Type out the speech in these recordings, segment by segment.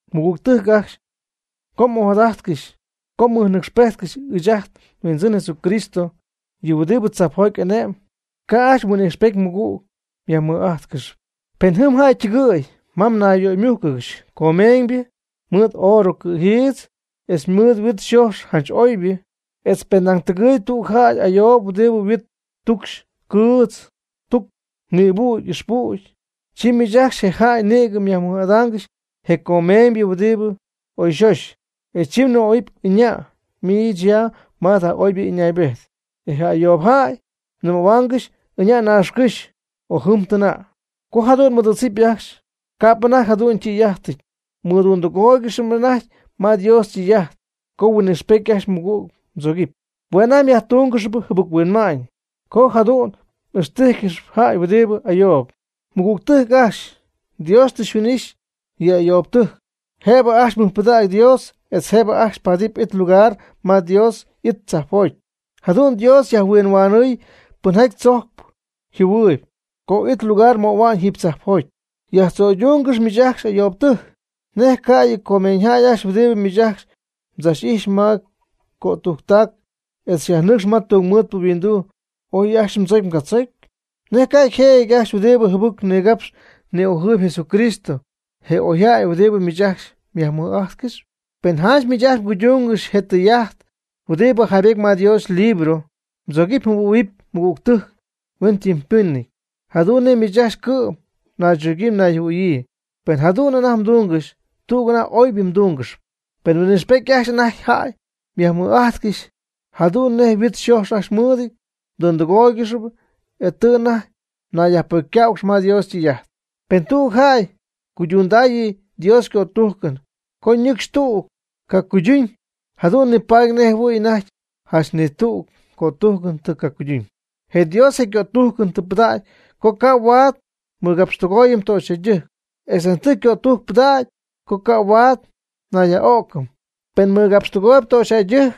Mɨgügtɨjc ajcxy, co m'ojadajtcɨxy co mmɨjnɨcxpejtcɨxy ɨɨch ajt nHuindzɨn Jesucristo, yɨ huɨdibɨ tzajpjoty ane'm, ca' ajcxy huin'ijxpety mɨgügtɨjc myajmɨj'ajtcɨxɨpy. Pen jɨm jäy ytɨgɨ̈y ma mnayyöymújcɨgɨxy comeeñybɨ mɨɨd oorɨ cɨ̈jiitz, etz mɨɨd yhuit yxojx janch oybɨ, etz pen nañ tɨgɨɨyb tüg jäy ayoob huɨdibɨ yhuit ytucxy cɨɨtz tuc nïbüdy ixpüdy. Chi miich ajcxy je' jac nïgɨ myajmɨj'ada'ñ je comeeñybɨ huɨdibɨ oyxoxy, e chi mnɨmähua'ñ: “Ɨña' miich ya ma jada oybɨ ɨñaaybejt.” E je ayoob jäy mnɨmähuaangɨxy: “Ɨña' naaxcɨ́xy o jɨm jadu'n tɨna'.” Co jadu'n m'ɨdɨ̈tzɨp ajcxy, ca'p anajty jadu'n ytɨy'ajtɨty. Mdundɨgooygɨxy anajty ma Dios ytɨy'ajt co huin'ijxpety ajcxy mɨgüg mdzogɨpy. Hue' anajty myajtungɨxyp jɨbɨc-huinma'ñ co jadu'n m'ixtíjcɨxɨpy jäy huɨdibɨ ayoob. Mɨgügtɨjc ajcxy, Dios tɨ huin'ixy yɨ ayoobɨtɨjc, jëbɨ ajcxy mɨjpɨdägy Dios etz jëbɨ ajcxy paadɨpy it lugar ma Dios y'it tzajpjoty. Jadu'n Dios yajhuinhuanɨɨy pɨnjaty tzojcɨp jɨhuɨɨyɨp co it lugar möhua'ñ jiiby tzajpjoty. Myajtzo'yduungɨxyp miich ajcxy ayoobtɨjc. ¿Nej cayɨ comeeñyjäy ajcxy huɨdibɨ miich ajcxy xychachxɨ̈p ma cötujctac, e xyajnɨcxcɨxy ma tungmɨɨdpɨ yhuinduu, oy ajcxy mdzocy mgatzocy? ¿Nej ca yjëjɨty ajcxy huɨdibɨ jɨbɨc nigapxp ni'ojɨɨyb Jesucristo, je oyjäy huɨdibɨ miich ajcxy myajmɨj'ajtcɨxyp? Pen janch miich ajcxy mguydungɨxy je tɨy'ajt huɨdibɨ jaybety ma Dios ylibro: “Mdzogɨpy mjɨhuɨ̈huɨpy mmɨgügtɨjc hueñytɨmypɨnɨty, jadu'n nej miich ajcxy cɨ'm mnaychogyii mnayjɨhuɨ̈yii.” Pen jadu'n anajty mdungɨxy, tüg anajty oybɨ mdungɨxyp. Pen huin'ijxpety ajcxy anajty jäy myajmɨj'ajtcɨxy jadu'n nej yhuit yxoxy ajcxy mɨɨdɨty, mdundɨgooygɨxp, e tɨ anajty mnayyajpocycähuɨgɨxy ma Dios ytɨy'ajt. Pen tüg jäy cuydundaayɨ Dios ycötujcɨn, co nɨcxy tüg cacuyduñ, jadu'n nipaady nej jɨhuɨ̈y anajty janch ni tüg cötujcɨn tɨ cacuyduñ. Je Dios je cötujcɨn tɨ pɨdägy co ca' huaad mmɨgapxtɨgooyɨpy töxyjäydɨjc, etz nañ tɨ cötujcɨn pɨdägy co ca' huaad njäyyaj'o'cɨm. Pen mmɨgapxtɨgooyb töxyjäydɨjc,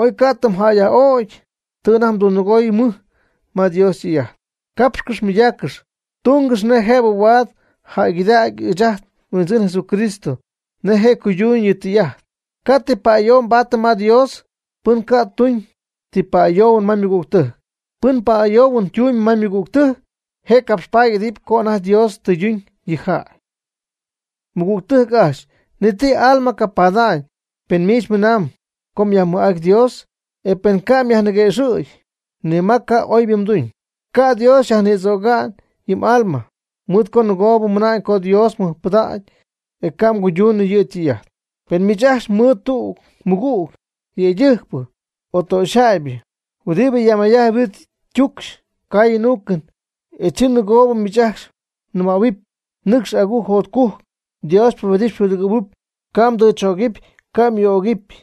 oy ca' tɨ mjäyyaj'ögy, tɨ anajty mdundɨgooy mɨj ma Dios ytɨy'ajt. Capxcɨx mɨydaccɨx, tungɨx nej jëbɨ huaad jäygɨdägy ɨɨch ajt nHuindzɨn Jesucristo nej je' cuyduñ yɨ' ytɨy'ajt. Ca' ti pa'ayoohuɨn paadɨpy ma Dios, pɨn ca' tuñ ti pa'ayoohuɨn ma ymɨgügtɨjc. Pɨn pa'ayoohuɨn tumb ma ymɨgügtɨjc, je' capxpaady y'idɨp co anajty Dios tɨyduñ yɨ' yjäy. Mɨgügtɨjc ajcxy, ni ti m'alma capada'ñ pen miich mmɨnaamb co myajmɨj'ajtyp Dios, e pen ca' myajniguëxɨ̈gy ni ma co oybɨ mduñ. Ca' Dios yajnïdzöga'ñ yɨ m'alma mɨɨd co nɨgoob mmɨna'ñ co Dios mmɨjpɨdägy, e ca' mguydunɨ yɨ' ytɨy'ajt. Pen miich ajcxy mɨɨd tüg mɨgüg yëydɨjcpɨ o töxyjäybɨ huɨdibɨ yajmayjajtp yhuit ytucxy caayɨn uucɨn, e chi nɨgoo miich ajcxy mnɨmähuɨpy: “Nɨcx agujc jotcujc, Dios xypubedɨpy xypudɨgɨ̈huɨpy, ca' mdɨɨch'ögɨpy ca' myuu'ögɨpy.”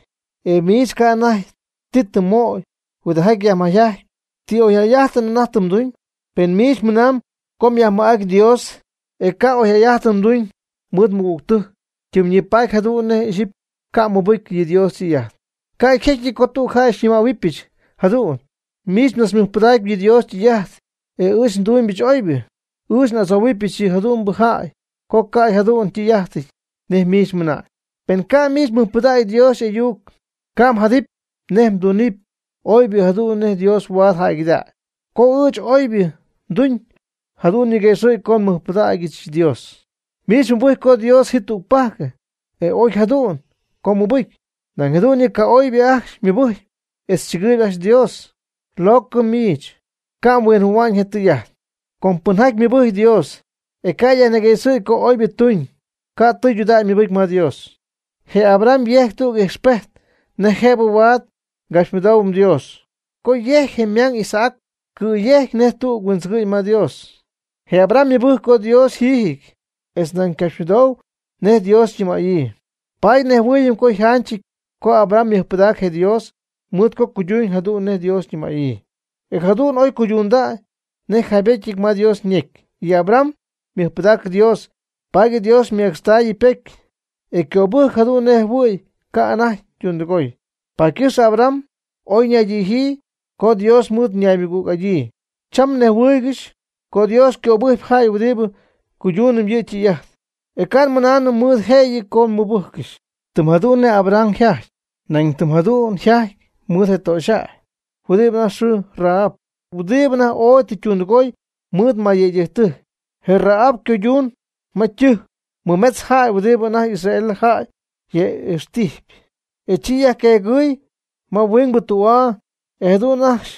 E miich ca' anajty ti tɨ mmöy huɨdijaty yajmayjajtpy. ¿Ti oyjäy'ajtɨn anajty tɨ mduñ? Pen miich mɨnamb co myajmɨj'ajtyp Dios, e ca' oyjäy'ajtɨn mduñ mɨɨd mmɨgügtɨjc, ytimyñipatyp jadu'n nej ixyipy ca' mmɨbɨcy yɨ Dios ytɨy'ajt. Ca' yjecyɨty co tüg jäy xyñɨmähuɨbɨch jadu'n: “Miich mdzachmɨjpɨdacpy yɨ Dios ytɨy'ajt, e ɨɨch ndumybɨch oybɨ.” Ɨɨch n'adzohuɨpyɨch yɨ jadu'mbɨ jäy co ca' jadu'n ytɨy'ajtɨty nej miich mɨna'ñ. Pen ca' miich mmɨjpɨdägy Dios y'ayuc, ca' mjadɨpy nej mdunɨpy oybɨ jadu'n nej Dios huaad jäygɨdägy. Co ɨɨch oybɨ nduñ, jadu'n ñigüexɨ̈gy co nmɨjpɨdägyɨch Dios. Miich mmɨbɨjcpy co Dios ji tügpajc, e oy jadu'n co mmɨbɨcy. Nañ jadu'n yɨ ca'oybɨ ajcxy mɨbɨjcp etz chɨgɨɨyb ajcxy Dios. Locɨ miich, ca' mhuinjɨhuɨ̈hua'ñ je tɨy'ajt. Co pɨnjaty mɨbɨcy Dios, e ca' yajniguëxɨ̈gy co oybɨ tuñ, ca' tɨydudägy mɨbɨcy Dios. Je Abraham yejc tüg ijxpejt nej jëbɨ huaad ngapxymɨdoohuɨm Dios co jecy'ajty je' ymang Isaac cɨ̈yejcy nej tüg huindzɨgɨ'ñ ma Dios. Je Abraham ymɨbɨjc co Dios yjiijɨty etz nañ ycapxymɨdou nej Dios ñɨmaayɨ. Paady nejhuɨɨyɨm co yjanchɨty co Abraham mɨjpɨdacy je' Dios mɨɨd co cuyduuñ jadu'n nej Dios ñɨmaayɨ. E jadu'n oy cuydundäy nej yjaybetyɨty ma Dios ñecy: “Yɨ Abraham ymɨjpɨdac Dios, paady Dios ymecxtaayɨ ypocy, e ycöbɨjcɨ jadu'n nej jɨhuɨ̈y ca' anajty ytundɨgoy.” Paady ycɨxpɨ Abraham oyñaydijyii: “Co Dios mɨnaymɨgüg'adyii.” Cham nejhuɨɨygɨx co Dios ycöbɨjcpy jäy huɨdibɨ cuydungɨxp yɨ' ytɨy'ajt, e ca' nmɨnaanɨm mɨɨd jëyɨ co ymɨbɨjccɨxy. Tɨm jadu'n nej Abraham yjajty, nañ tɨm jadu'n yjajty mɨɨd je töxyjäy huɨdi anajty yxɨɨ Rahab, huɨdibɨ anajty ooy tɨ ytundɨgoy mɨɨd mayyëydɨjc. Je Rahab ycoyüdz ma ytɨjc nimetz jäy huɨdibɨ anajty Israel jäy yaj'ijx'ijtyp, e chi yajqueegɨɨy ma huingbɨ tü'aa, e jadu'n ajcxy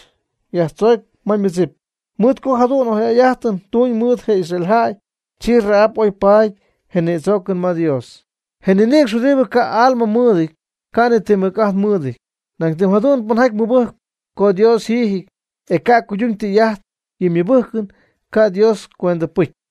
yajtzoocy ma ymɨdzip. Mɨɨd co jadu'n oyjäy'ajtɨn tuñ mɨɨd je Israel jäy, chi Rahab oy paady je nïdzoocɨn ma Dios. Je ninïcx huɨdibɨ ca' alma mɨɨdɨty, ca' ni ti mɨc'ajt mɨɨdɨty. Nañ tɨm jadu'n pɨnjaty mɨbɨjcp co Dios yjiijɨty, e ca' cuyduñ Dios ytɨy'ajt, yɨ' ymɨbɨjcɨn ca' Dios cuendɨpɨcy.